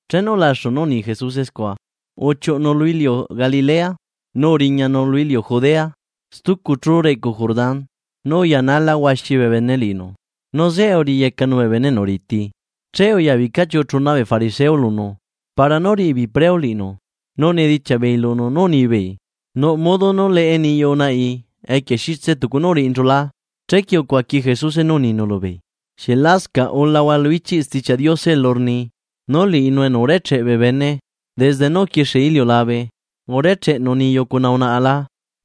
Chenu ulaxu nú uni Jesuse scua, uchiuꞌunu lu iliu Galilea nu uriñanu lu iliu Judea stucu chú reꞌcu Jordán. Nu uyanala huaxi bee bene liꞌinu, nu zeꞌe uriyecanu bee bene enu riti. Che uyabica chiucu chuna bee fariseo lunu para nú riꞌi beei preu liꞌinu, nu unedichiaꞌ beei lunu nú unibeei: ―¿Nuꞌ modo nú leꞌe niyu unaꞌai equie xitse tucu nú uriꞌinchu la? Chequie ucuaqui Jesuse nú uninu lubeei: ―¿Xieꞌ lasca ulahua lu ichiꞌ Stichiaꞌ Diose elu rni, nú liꞌinu enu urecheꞌ bee bene desde nú uquixie iliulabe, “urecheꞌnu niyu cuna unaꞌa la”?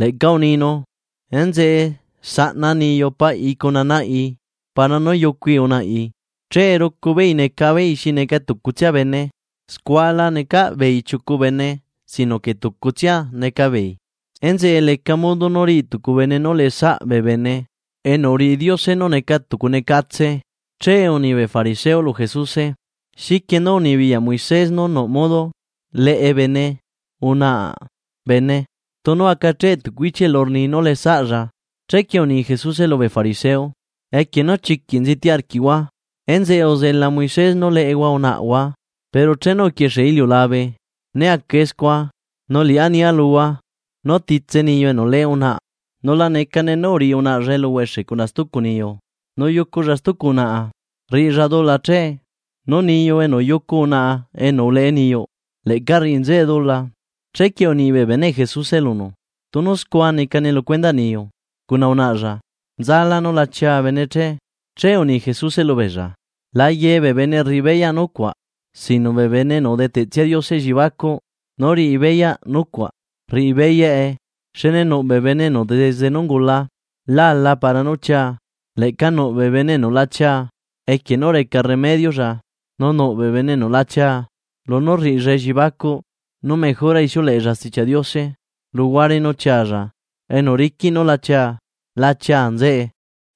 Leꞌca uninu: “Enzeꞌe zaꞌna niyu paꞌi cuna naꞌi para nú yucui unaꞌi, che rucu beei neca beei xi neca tucutsia bene.” Scua la necaꞌ beei chiucu bene, sino que tucutsia neca beei. Enzeꞌe leca modo nú riꞌi tucu bene nú leꞌesaꞌ bee bene enu uriꞌi Diose nú neca tucunecatse. Che uni bee fariseo lu Jesuse: ―¿Xiquie nú unibiyaꞌ Moisés nú nuꞌ modo leꞌe bene unaꞌa bene, tunu acacheꞌ tucu ichiꞌ elu rni nú leꞌe saꞌlla? Chequie uni Jesuse lubee fariseo: ―Equie nú chiquiꞌ nziti arquiꞌhua, enzeꞌe uzela Moisés nú leꞌehua unaꞌahua. Pero chenu uquixie iliulabe né acae scua. Nu Liꞌá nia luhua nú titse niyu enu leꞌe unaꞌa, nu la necane nú uriꞌi unaꞌalla eluhuexe cuna stucu niyu, nu yuculla stucu unaꞌa, rriꞌilla dula che, nu niyu enu yucu unaꞌa enu uleꞌe niyuꞌ, leꞌca rriꞌi nzeꞌe dula. Chequie uni bee beneꞌ Jesuse lunu: ―Tunu scua necane lu cuendaꞌ niyu cuna unaꞌalla, nzalá nú la chia bene che. Che uni Jesuse lubeella: ―La ye bee bene rriꞌi beyaꞌ nucuaꞌ, sino que bee bene enu udeteꞌtsia Diose elliebacuꞌ nú riꞌi beyaꞌ nucuaꞌ rriꞌi beyaꞌe. Xne nuꞌ bee bene enu desde nú ungula lá ala para nú chia, leꞌca nuꞌ bee bene enu la chia equie nú reca remediolla, nu nuꞌ bee bene enu la chia lunú rriꞌilla elliebacuꞌ nú mejora ixiuleꞌella Stichiaꞌ Diose luhuare nú chialla. Enu riquiꞌ núla chia, la chia nzeꞌe.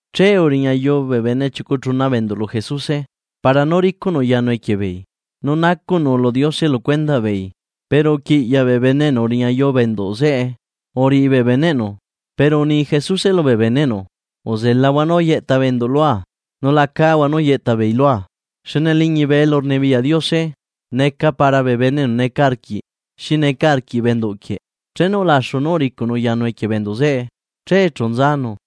Che uriñayu bee bene chiucu chuna bee enduꞌ lu Jesuse para nú ricuꞌnu yanu equie beei nu nacuꞌnu lu Diose lu cuendaꞌ beei, pero uquiꞌyaꞌ bee bene enu uriñayu bee enduꞌ zeꞌe uriꞌi bee beneꞌnu. Pero uni Jesuse lubee beneꞌnu: ―Uzelahua nú yeꞌta bee enduꞌ lua, nu la cahua nú yeꞌta beei lua, xne liñibe elurnibiyaꞌ Diose neca para bee bene enu neca arquiꞌ xi neca arquiꞌ bee enduꞌ quieꞌ. Chenu ulaxu nú uricuꞌnu yanu equie bee enduꞌ zeꞌe, che chu nzanu.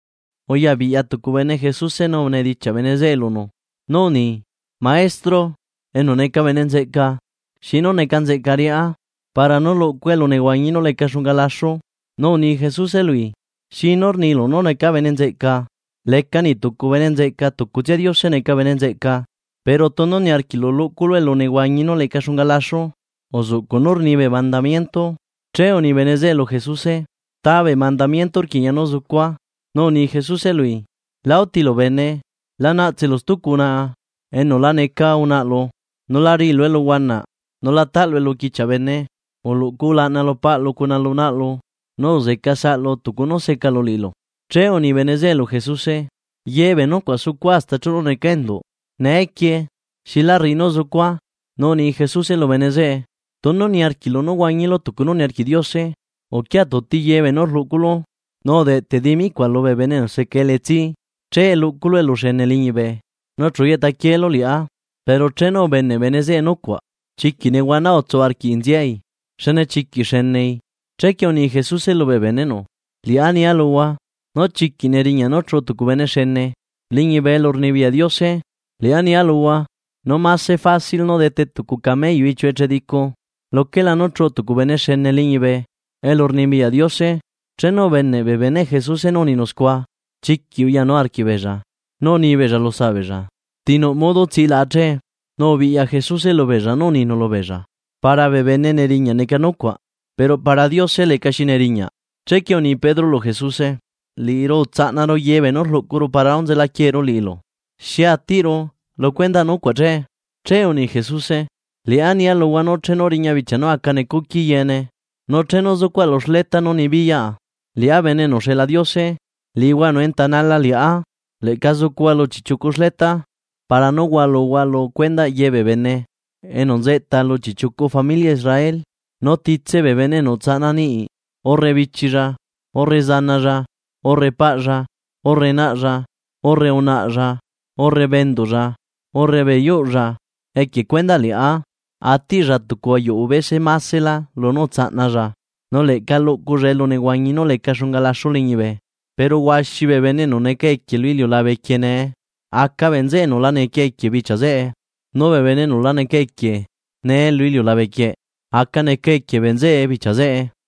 Uya biꞌya tucu bene Jesuse nu unedichiaꞌ bene zeꞌe lunu nú uni: ―Maestro enu neca bene nzeꞌca, ¿xi nú neca nzeꞌca riꞌá para nú luꞌcua elunehuañi nú leca xunga laxu? Nu uni Jesuse lui: ―¿Xinú rnilu nú neca bene nzeꞌca? Leca niꞌ tucu bene nzeꞌca tucutsia Diose neca bene nzeꞌca. Pero tunu niarquiꞌlu luꞌculu elunehuañi nú leca xunga laxu liñibe, uzuꞌcuꞌ nú rni bee mandamiento. Che uni bene zeꞌe lu Jesuse: ―¿Ta bee mandamiento rquiꞌña nú zucua che? Nu uni Jesuse lui: ―La utilu bene, la naꞌtselu stucu unaꞌa enu la neca unaꞌalu, nu la riꞌilu eluhuanaꞌ, nu la taꞌlu eluquichiaꞌ bene, uluꞌcu ulaꞌna lu paꞌlu cuna lu naꞌlu, nu uzeca saꞌlu tucu nú secalu liꞌilu. Che uni bene zeꞌe lu Jesuse: ―Ye bee nucuaꞌ sucua hasta chenu necaa enduꞌ; ¿neequie xilá rriꞌi nú zucua? Nu uni Jesuse lu bene zeꞌe: ―Tunu niarquiꞌlu nú huañilu tucu nú niarquiꞌ Diose, uquia tuti ye beenú rluꞌculu nu udeꞌteꞌ dimicuaꞌ lubee bene enu seca elitsi, che luꞌculu eluxene liñibe, nu chu yeꞌta quielu Liꞌá. Pero chenu ubeneꞌ bene zeꞌe nucuaꞌ, chiquiꞌ nehuana utsu arquii nziai xne chiquiꞌ xenei. Chequie uni Jesuse lubee beneꞌnu: ―Liꞌá nia luhua, nú chiquiꞌ neriñaꞌ nú chuꞌu tucu bene xene liñibe elurnibiyaꞌ Diose. Liꞌá nia luhua, nú mase facil nú dete tucu cameyu iꞌchiu echedicu, luquelá nú chuꞌu tucu bene xene liñibe elurnibiyaꞌ Diose. Chenu ubeneꞌ bee beneꞌ Jesuse nú uninu scua, chiquiꞌ uyanu arquiꞌ beellla, nú uni beella lusaꞌ beella: ―¿Ti nuꞌ modo tsilaꞌa che? Nu ubiꞌya Jesuse lubeella nu uninu lubeella: ―Para bee bene neriñaꞌ neca nucuaꞌ pero para Diose lecaxi neriñaꞌ. Chequie uni Pedro lu Jesuse: ―Liꞌiru utsaꞌnaru ye beenú rluꞌcuru para nú nzela quieeru liꞌilu. ¿Xi atiꞌru, lu cuendaꞌ nucuaꞌ che? Che uni Jesuse: ―Liꞌá nia luhua nú chenu riña bichia nú aca necuqui yeene, nu chenu zucuaꞌa lu xleta nú nibiyaꞌa liꞌá Bene enu uxeꞌla Diose, liꞌihua enu entanala liꞌá leꞌca zucuhua lu chiꞌchiucu xleta, para nú hualuhua lu cuendaꞌ ye bee bene enu nzeꞌta lu chiꞌchiucu familia Israel. Nu titse bee bene enu utsaꞌna niꞌi, urre bichilla, urre zanalla, urre paꞌlla, urre naꞌlla, urre unaꞌalla, urre bee enduꞌlla, urre bee yuꞌlla equie cuendaꞌ Liꞌá, atiꞌlla tucu ayuꞌu bese masela lunú utsaꞌnalla, nu leꞌca luꞌculla elunehuañi nú leca xunga laxu liñibe. Pero huaxi bee bene enu neca equie lu iliulabe quieꞌ nee, aca bee nzeꞌe enu la neca equieꞌa bichia zeꞌe, nu bee bene enu la neca equie nee lu iliulabe quieꞌ, aca neca equie bee nzeꞌe bichia zeꞌe.